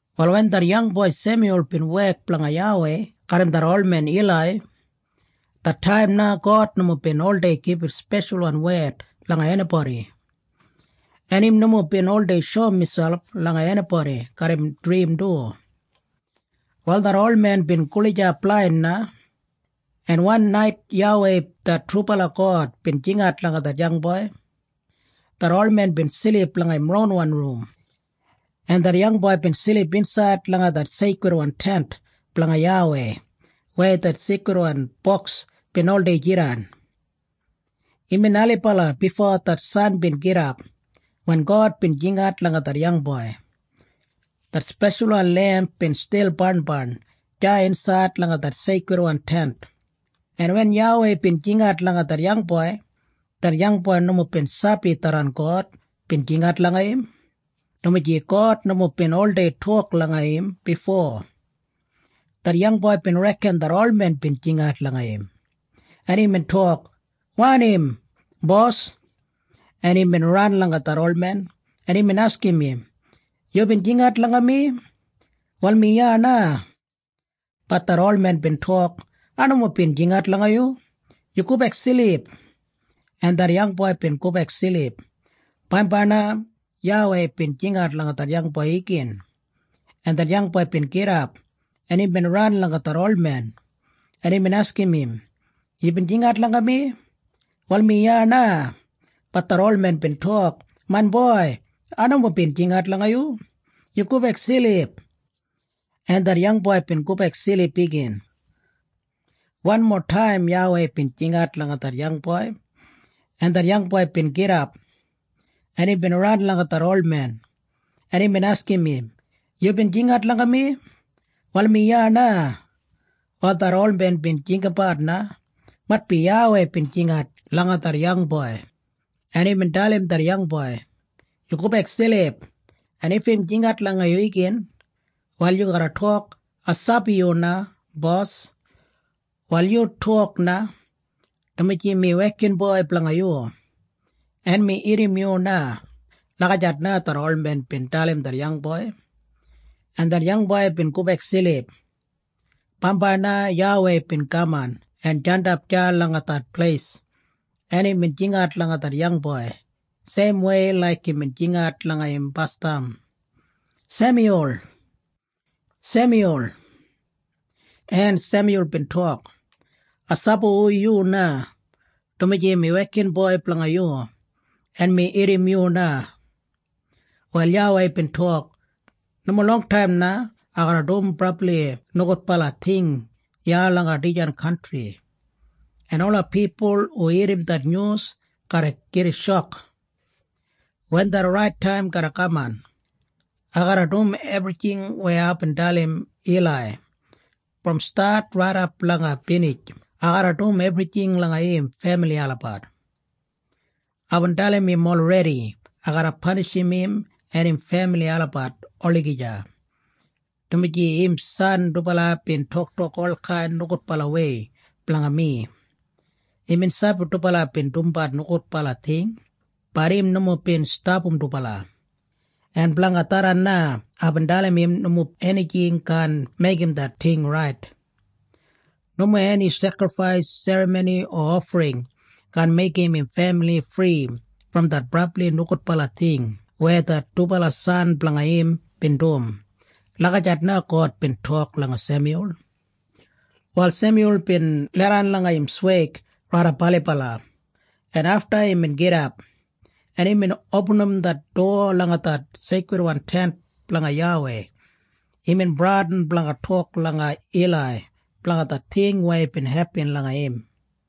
Wal wen det yangboi Semyul bin wek blanga YAWEI garram det olmen Ilai, det taim na God nomo bin oldei gibit speshalwan wed langa enibodi, en im nomo bin oldei shoum miselp langa enibodi garram drim du. Wal det olmen bin gulijap blain na, en wan nait YAWEI det trubala God bin jingat langa det yangboi. Det olmen bin silip langa im ronwan rum, en det yangboi bin silip insaid langa det Seikridwan Tent blanga YAWEI weya det Seikridwan Boks bin oldei jidan. Imbin ailibala bifo det san bin gidap wen God bin jingat langa det yangboi. Det speshalwan lemp bin stil barnbarn deya insaid langa det Seikridwan Tent, en wen YAWEI bin jingat langa det yangboi, det yangboi nomo bin sabi tharran God bin jingat langa im, dumaji God nomo bin oldei tok langa im bifo. Det yangboi bin reken det olmen bin jingat langa im, en imbin tok, “Wanim, bos?” En imbin ran langa det olmen, en imbin askim im, “Yubin jingat langa mi? Wal mi iya na.” Bat det olmen bin tok, “Ai nomo bin jingat langa yu. Yu gobek silip.” En det yangboi bin gobek silip. Bambai na YAWEI bin jingat langa det yangboi igin, en det yangboi bin gidap, en imbin ran langa det olmen, en imbin askim im, “Yubin jingat langa mi? Wal mi iya na.” Bat det olmen bin tok, “Main boi, ai nomo bin jingat langa yu. Yu gobek silip.” En det yangboi bin gobek silip igin. Wanmo taim YAWEI bin jingat langa det yangboi, en det yangboi bin gidap, en imbin ran langa det olmen, en imbin askim im, “Yubin jingat langa mi? Wal mi iya na.” Wal det olmen bin jinggabat na maitbi YAWEI bin jingat langa det yangboi, en imbin dalim det yangboi, “Yu gobek silip. En if im jingat langa yu igin, wal yu garra tok, ‘Ai sabi yu na, Bos. Wal yu tok na, dumaji mi wekinboi blanga yu, en mi irrim yu na.’” Lagijat na det olmen bin dalim det yangboi, en det yangboi bin gobek silip. Bambai na YAWEI bin kaman en jandap deya langa det pleis, en imbin jingat langa det yangboi seimwei laik imbin jingat langa im basdam, “Semyul! Semyul!” En Semyul bin tok, “Ai sabi hu yu na, dumaji mi wekinboi blanga yu, en mi irrim yu na.” Wal YAWEI bin tok, “Nomo longtaim na ai garra dum brabli nogudbala ting iya langa dijan kantri, en ola pipul hu irrim det nyus garra gida shok. Wen det rait taim garra kaman, ai garra dum ebrijing weya aibin dalim Ilai. Brom stat raidap langa binij ai garra dum ebrijing langa im femili olabat. Aibin dalim im olredi ai garra panishim im en im femili olabat olagija, dumaji im san dubala bin toktok olkain nogudbalawei blanga mi. Imbin sabi dubala bin dumbat nogudbala ting. Bat im nomo bin stapam dubala. En blanga tharran na aibin dalim im nomo enijing kaan meigim det ting rait. Nomo eni sekrifais serramoni o ofring kaan meigim im femili fri brom det brabli nogudbala ting weya det dubala san blanga im bin dum.” Lagijat na God bin tok langa Semyul. Wal Semyul bin leidan langa im sweig raidap ailibala, en afta imbin gidap, en imbin opinim det dowa langa det Seikridwan Tent blanga YAWEI. Imbin bradin blanga tok langa Ilai blanga det ting weya bin hepin langa im.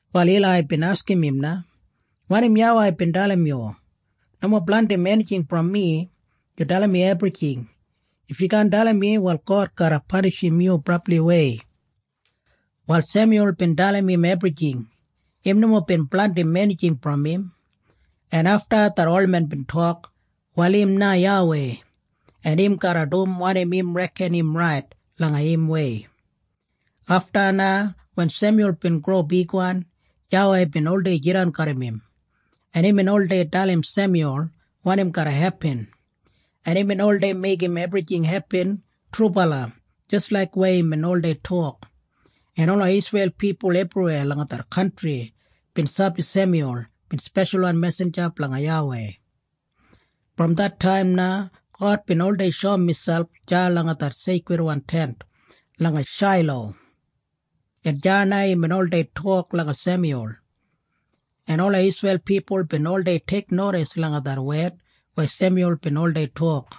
Wal Ilai bin askim im na, “Wanim YAWEI bin dalim yu? Nomo blandim enijing brom mi. Yu dalim mi ebrijing. If yu kaan dalim mi, wal God garra panishim yu brabliwei.” Wal Semyul bin dalim im ebrijing. Im nomo bin blandim enijing brom im, en afta det olmen bin tok, “Wal im na YAWEI, en im garra dum wanim im reken im rait langa imwei.” Afta na wen Semyul bin gro bigwan, YAWEI bin oldei jidan garram im, en imbin oldei dalim Semyul wanim garra hepin, en imbin oldei meigim ebrijing hepin trubala jis laik weya imbin oldei tok, en ola Isreil pipul ebriweya langa det kantri bin sabi Semyul bin speshalwan mesinja blanga YAWEI. Brom det taim na God bin oldei shoum miselp deya langa det Seikridwan Tent langa Shailo, en deya na imbin oldei tok langa Semyul, en ola Isreil pipul bin oldei teiknodis langa det wed weya Semyul bin oldei tok.